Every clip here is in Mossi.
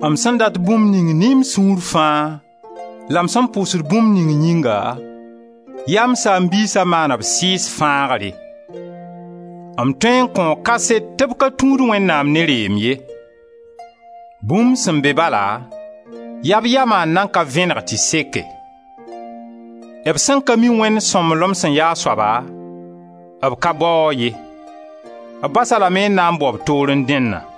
M sẽn dat bũmb ning ne m sũur fãa la m sẽn pʋʋsd bũmb ning yĩnga, yaa m saam-biisa maan b sɩɩg fãagre. M tõe n kõo kaset tɩ b ka tũud Wẽnnaam ne reem ye; bũmb sẽn be bala, yaa b yama n nan ka vẽneg tɩ seke. B sẽn ka mi Wẽnd sõmblem sẽn ya a soaba, b ka bao-a ye, b bas-a lame n na n bao b toorẽ dẽnna.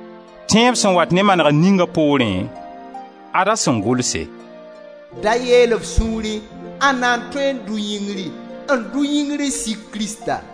Tẽeb sen wat ne manegr ninga poorẽ, ad-a sẽn gʋlse: «Da yeel f sũurẽ: ãnda n tõe n dʋ yĩngri,» n dʋ yĩngr n sik Krista?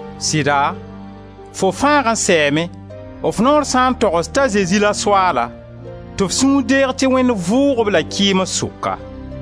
Sɩda, fo fãag n sɛɛme, f noor sã n togs t'a Zezi la Soaala tɩ f sũur deeg tɩ Wẽnd vʋʋg-b la kɩɩms sʋka.